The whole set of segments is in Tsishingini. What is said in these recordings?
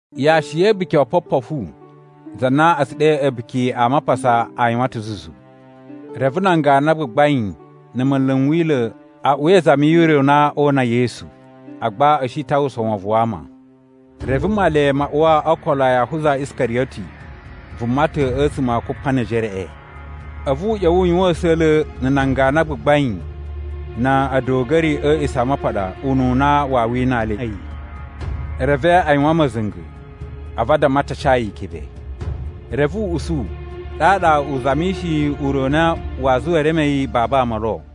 Yashi ya̱ A̱buki o Opopofu, za na a̱ tsu ɗe A̱buki a Mapasa, a yuwan ta̱ zuzu. Reve nan ganu a gbagbain na̱ munlu n Wila̱ a uwa izami yu ure u na oo una Yesu. Agba a̱ shi ta uwwusa wovon wa ama. Reve Male ma uwa o okolo a Yahuza Iskariyoti, vuma ta̱ a̱tsuma̱ a Kupanejereꞌe. A̱vu u ꞌya̱wa̱ u yuwan a̱sa̱la̱ na̱ nan ganu a gbagbain na̱ a̱duga̱ri a̱ A̱a̱ꞌisamapaɗa ununa waa winaa le a̱yi. Reve a yuwan ma̱za̱nga̱, a̱vu a damma a ta ca yi ikebe. Reve u usu, ɗaɗa u zamishiyi ure u na waa zuwa e reme yi babu ama lo.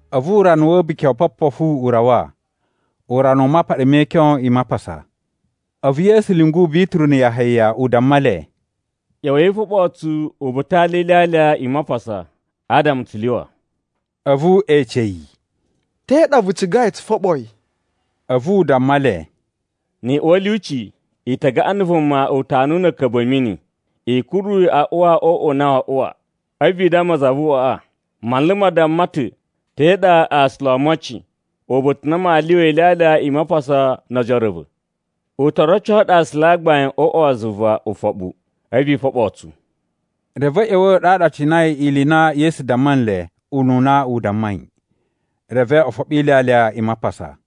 A̱vu urana wa̱ A̱buki o Opopofu u rawa, urana u mapaɗa me ikyon i Mapasa. A̱vu Yesu lyungu Bituru na̱ Yahaya u damma le, “ꞌYa̱wa̱i i foɓoo tsu uba̱ta̱ a alya e ilyalya i Mapasa, adama tsu lyuwa.” A̱vu e ece yi, “Te ɗa vu cigai tsu foɓo yi?” A̱vu u damma le, “Ni i uwa a̱ lyuci, i ta gaꞌan na̱ vuma utanuwu na̱ a̱a̱ka̱bu a̱ mini. I kuru yi a uwa o uꞌwa u na waa uwa, a̱vu i damma za vu uꞌwaꞌa, ‘Manlu ma damma ta̱: Te ɗa aasula o omocin, uba̱ta̱ u na maa lyuwa ilyalya i Mapasa no ojoro a̱ va̱?’ U to roco ɗu aasula a gbain o uꞌwa wa zuva ufoɓu, a̱vu i foɓoo tsu.” Reve a̱ ꞌya̱wa̱ ɗaɗa a cinai ili i na Yesu damma nle ununa u dammai. Reve o foɓo ilyalya i Mapasa.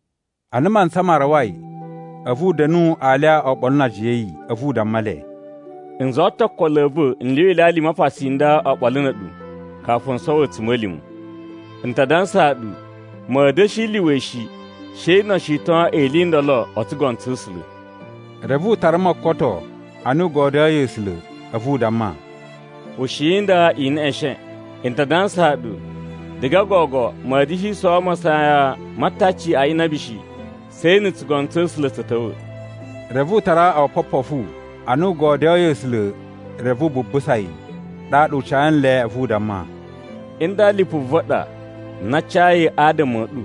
Ana mantsa ma rawai, a̱vu u da̱nu alya oɓolo na ajiya a̱ yi. A̱vu u damma le, “N zuwa ta̱ okolo a̱ va̱ n lyuwa ilyalya i Mapasa i nda oɓolo na̱ a̱ɗu, kafu n sowo a̱tsuma̱lima̱. N ta dansaa ɗu, ma̱a̱ da̱shi lyuwa yi shi, she no o shiton ili i ndolo o tsugono tsa̱ A̱sula̱.” Reve u tara mokoto ana u godyoyi A̱sula̱, a̱vu u damma, “Ushiyi nda, i neꞌeshen. N ta dansaa ɗu, diga gogo ma̱a̱ da̱shi sowo masayan ma ataci a inabi shi, she na̱ tsugono tsa̱ A̱sula̱ tsa̱ ta̱wa̱.” Reve u tara opopofu, ana u godyoyi A̱sula̱, reve u bubusa yi. Ɗaɗa u ca nle, a̱vu u damma, “Nda lipu va̱ ɗa na a cayi adama a̱ ɗu.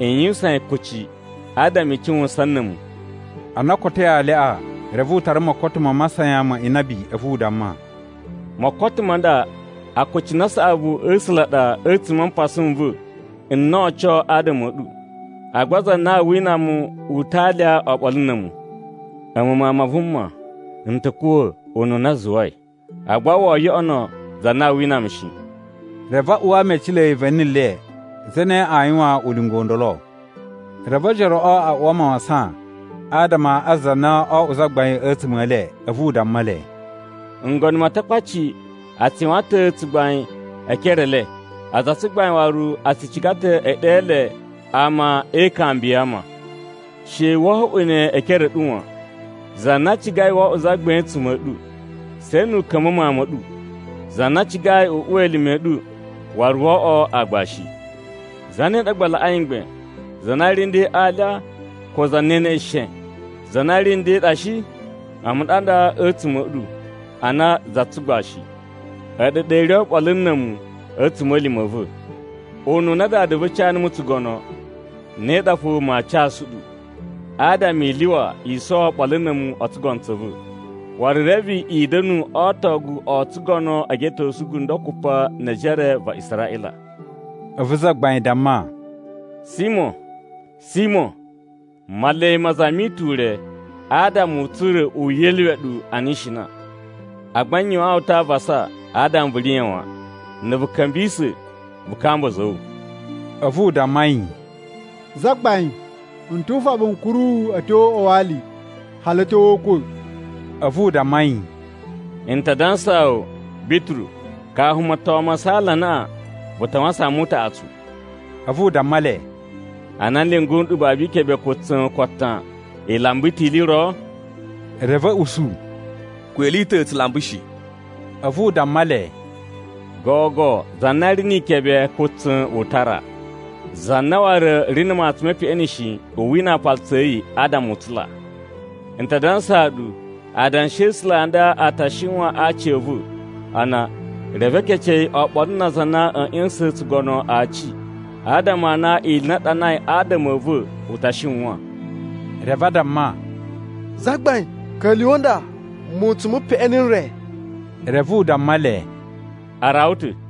I yuwusan ne kuci, adama i cuwusan na̱ a̱mu.” Ana o kotoi alyaꞌa, reve u tara mokoto ma masayan ma inabi, a̱vu u damma, “Mokoto ma nda akucunu a saꞌavu a̱ A̱sula̱ a ɗa a̱tsuma̱ a mpasa n va̱ n na oo oco adama a̱ ɗu. Agba za na aa wina mu u ta alya oɓolo na̱ a̱mu. A̱mu Mawun ma Vuma n ta̱ kuwa̱ ununa a zuwai. Agba woo yoꞌono za na aa wina mu shi!” Reve a uwa mecilei va̱ni le, zane aa yuwan ulinga u ndolo. Reve ojoroꞌo a uwa mawasan adama a za na oo oꞌwo zagbain a̱tsuma̱ e le. A̱vu u damma le, “Ngono ma Atakpaci a tsu yuwan ta̱ tsugbain e ekere e le. Aza a tsugbain waru a tsu ciga ta̱ e ɗe le Ama e Ikambi ya Ama. She wo oꞌwo ne e ekere ɗu wan. Za na cigai wo oꞌwo zagbain a̱tsuma̱ a̱ ɗu, she nu u ka̱mba̱ mawun ma̱ ɗu. Za na cigai u uwa elime a̱ ɗu waru wo oꞌwo aagbashi. Zane ɗa gba laꞌai mgbain, za na ri nden a alya ko za na e neꞌesheshen? Za na ri nden ɗa shi? A̱mu ɗa nda a̱tsuma̱ a̱ ɗu ana za tsugbashi. A̱ɗu ɗa i ri oɓolo na̱ a̱mu a̱ a̱tsuma̱lima̱ a̱ va̱. Ununa Dada va̱ ca numu tsugono, ne ɗa fo maa casu ɗu, adama i lyuwa i sowo oɓolo na̱ a̱mu o tsugono tsa̱ va̱. Waru reve i da̱nu o otogu o tsugono e geꞌetosu gundo kupa ne ejere va Israꞌila.” A̱vu Zagbain damma, “Simo, Simo, Male ma zami ta̱ ure adama u tsura̱ u yeluwe ɗu ana ishina. Agba n yuwaan wu ta̱ avasa adama vu riya̱ wan. Na̱ vu ka̱mbisa̱, vu kamba a̱za̱ a̱ wu.” A̱vu u damma yi, “Zagbain, n tu ufoɓu n kuru wu a̱ tyo o uꞌwa wa ali, hali a̱ tyo o ukwa̱.” A̱vu u damma yi, “N ta dansaa wu, Bituru, kafu moton ma saala anaꞌan, vu ta wasan mu utaꞌatsu.” A̱vu u damma le, “Ana n lyungu nɗu babu ikebe ko tsa̱n ko atan, i lamba ta̱ ili i ro?” Reve a̱ usu, “Ko ili i ta̱ tsu lamba shi.” A̱vu u damma le, “Gogo za na ri ni ikebe ko tsa̱n u tara. Za na waru ri na̱ matsun me peꞌeni shi, u wina aapalutsu a̱ yi adama u tsula. N ta dansaa ɗu, adanshi a̱ A̱sula̱ a nda a ta shiwan a aci a̱ va̱, a na, ‘Reve e kece yi oɓolo na aza a na a̱ ꞌya̱sa̱sa̱a̱n tsugono aci,’ adama a na ili i na a ɗanai adama a̱ va̱ u ta shiwan.” Reve a damma, “Zagbain, ka̱lyuwa̱ nda mutsun mu peꞌeni n re.” Reve u damma le, “A rawa ta̱.”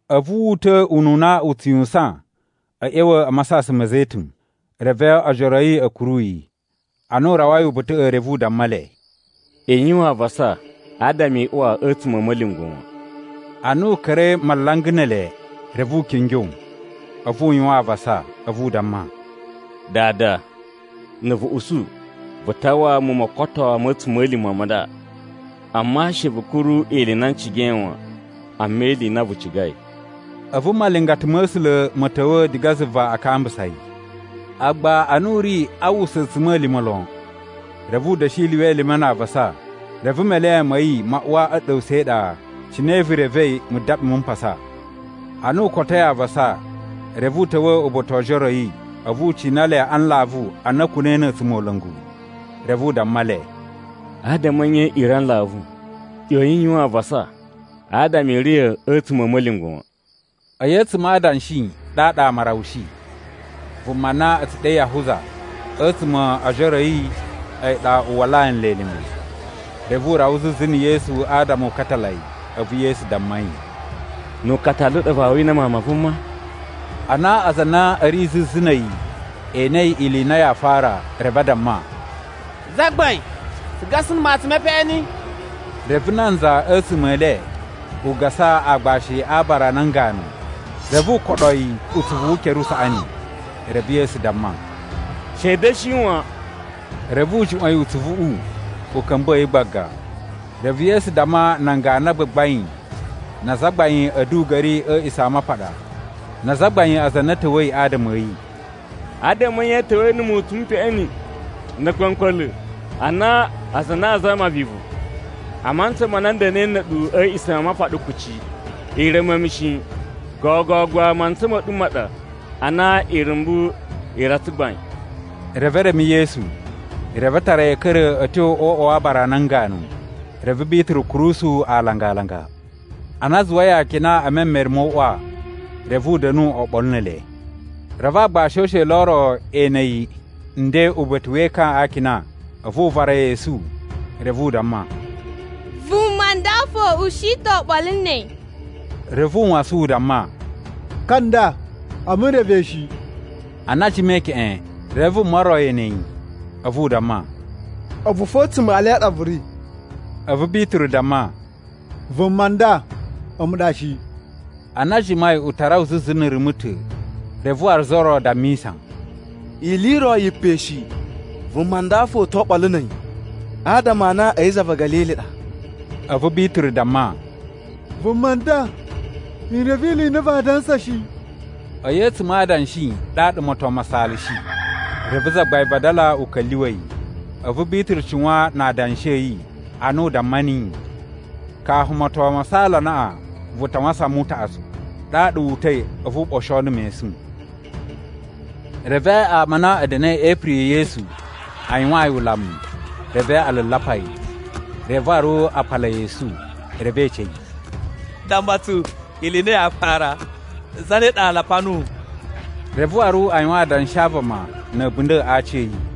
A̱vu wu uta̱ ununa u tsu yuwusan a̱ ꞌya̱wa̱ a Masasan ma̱ Zetun. Reve ojoro a̱ yi a̱ kuru yi. Ana u rawai uba̱ta̱ꞌa̱, reve u damma le, “I yuwan avasa adama i uwa a̱tsuma̱ a̱ ma̱lyungwa̱ wan.” Ana u ka̱ra̱i malanga ne ele, reve u kingyo, a̱vu u yuwan avasa. A̱vu u damma, “Dada, na̱ vu usu vu tawaa mu mokoto ma̱ a̱tsuma̱lima̱ ma nda. Amma she vu kuru ili i na n cigai wan, amma ili i na vu cigai.” [ A̱vu malingata ma̱ A̱sula̱ ma̱ ta̱wa̱ diga zuva a kambusa yi. Agba ana u ri a uwwusa a̱tsuma̱lima̱ lon, reve u da̱shi lyuwa elime na avasa, reve melen ma̱ yi ma uwa a̱ ɗa̱wusa̱ e iɗa, cine vu revei mudaɓi mu mpasa.] Ana u kotoi avasa, reve u ta̱wa̱ uba̱ta̱ wo ojoro a̱ yi, a̱vu u cina le a nlavu ana a̱ kuna̱i na̱ a̱tsumola̱ngu. Reve u damma le, “Adama a̱ nye i ri a nlavu? ꞌYoyin i yuwan avasa adama i riya̱ a̱tsuma̱ a̱ ma̱lyungwa̱ wan.” A̱yi a̱tsuma̱ a adanshi ɗaɗa ama a rawushi. Vuma na a̱ tsu ɗe Yahuza a̱tsuma̱ o ojoro a̱ yi a̱yi ɗa u walaa nle elime. Reve u rawa zuzu na̱ Yesu adama u katala yi. A̱vu Yesu damma yi, “Nu ukatalu u ɗa vaa wina Mawun ma Vuma?” Ana aza a na a̱ ri zuzu na̱ a̱yi e enei ili i na yaa fara, reve a damma, “Zagbain, tsu gasa na̱ matsun me peꞌeni?” Reve nanza a̱tsuma̱ e le u gasa aagbashi a aabara a nan ganu, reve u koɗo yi utsuvu wu ukere usaꞌani. Reve Yesu damma, “She i da̱shi wan.” Reve u juꞌwa̱n yi utsuvuꞌu u ka̱mbuwa̱ yi gbaga. Reve Yesu damma nan ganu a gbagbain na azagbain a̱ a̱duga̱ri a̱ A̱a̱ꞌisamapaɗa na azagbain aza a na a̱ ta̱wa̱i adama a̱ yi, “Adama a̱ nye i ta̱wa̱i na̱ mutsun mu peꞌeni na̱ a̱kpa̱mkpa̱la̱, ana aza a na a zama vivu? A mantsa ma na n da̱na̱i na̱ a̱ɗu a̱ A̱a̱ꞌisamapaɗa kuci, i reme mu shi. Gogo gba mantsa ma̱ ɗu ma ɗa, a na irumbu i ri a tsugbain.” Reve e reme Yesu, reve a tara yi a̱ ka̱ra̱ a̱ tyo o uꞌwa wa aabara a nan ganu. Reve Bituru kurusu alanga-alanga. Ana a zuwai akina e memere mo uꞌwa, reve u da̱nu oɓolo ne ele. Reve aagbashi o usheli o ro e ene yi nden uba̱ta̱ we ekan a akina, a̱vu u vara yi esu. Reve u damma, “Vuma nda fo u shi ta̱ oɓolo na̱ a̱yi.” Reve u wasan u damma, “Ka nda, a̱mu n reve yi shi.” Ana a jimai keꞌen, reve vuma ro e ene yi. A̱vu u damma, “A̱vu fo a̱tsuma̱ e ele a ɗa vu ri.” A̱vu Bituru damma, “Vuma nda, a̱mu ɗa shi.” Ana a jimai u ta rawa zuzu na̱ rumu ta̱, reve waru za ro dammisa, “Ili i ro yi pe shi vuma nda fo u to oɓolo na̱ a̱yi, adama a na a̱yi za va̱ Ga̱lili ɗa.” A̱vu Bituru damma, “Vuma nda, n reve ili i na vaa dansa shi.” A̱yi a̱tsuma̱ a adanshi ɗaɗa moton ma saalashi. Reve Zagbain vadala u ka̱lyuwa̱ yi. A̱vu Bituru cuwan na adanshi a̱ yi, ana u damma niyi, “Kafu moton ma saala anaꞌan, vu ta wasan mu utaꞌatsu.” Ɗaɗa wu uta̱i a̱vu u ɓosho na̱ mesun. Reve ama a na a̱ da̱na̱i e ipiri ya̱ Yesu a yuwaan yi ulamu, reve a lulapa yi. Reve waru a pala yi esu, reve e ece yi, “Damma tsu ili i na yaa fara! Zane ɗa lapa nuwu?” Reve waru a yuwan adanshi a vama na̱ a̱bunda̱ a aciya̱yi.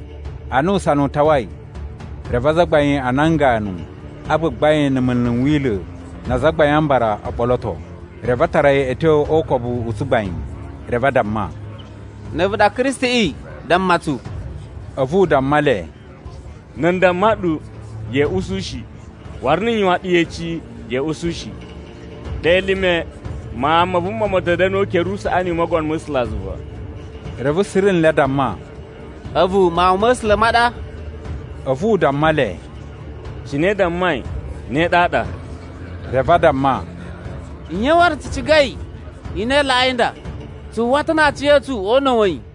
Ana usana u tawai, reve azagbain a nan ganu a gbagbain na̱ munlu n Wila̱ na Azagbain a Mbara o ɓoloto. Reve a tara yi a̱ tyo o ukobu u tsugbain, reve a damma, “Na̱ a̱vu ɗa Kristiꞌi, damma tsu.” A̱vu u damma le, “Na̱ n damma ɗu, ya̱a̱ usu shi, waru na̱ n yuwan ɗu yeci, ya̱a̱ usu shi. Ɗe elime, Mawun ma Vuma ma̱a̱ ta̱ da̱nu o ukere usaꞌani u Mogono ma̱ A̱sulazuva.” Reve suru nle a damma, “A̱vu Mawun ma̱ A̱sula̱ ma ɗa?” A̱vu u damma le, “Cine i dammai, ne ɗaɗa.” Reve a damma, “Nye waru tsu cigai i na i laꞌai nda? Tsu uwwa ta̱ na aciya̱tsu o una̱ wa̱ yi.”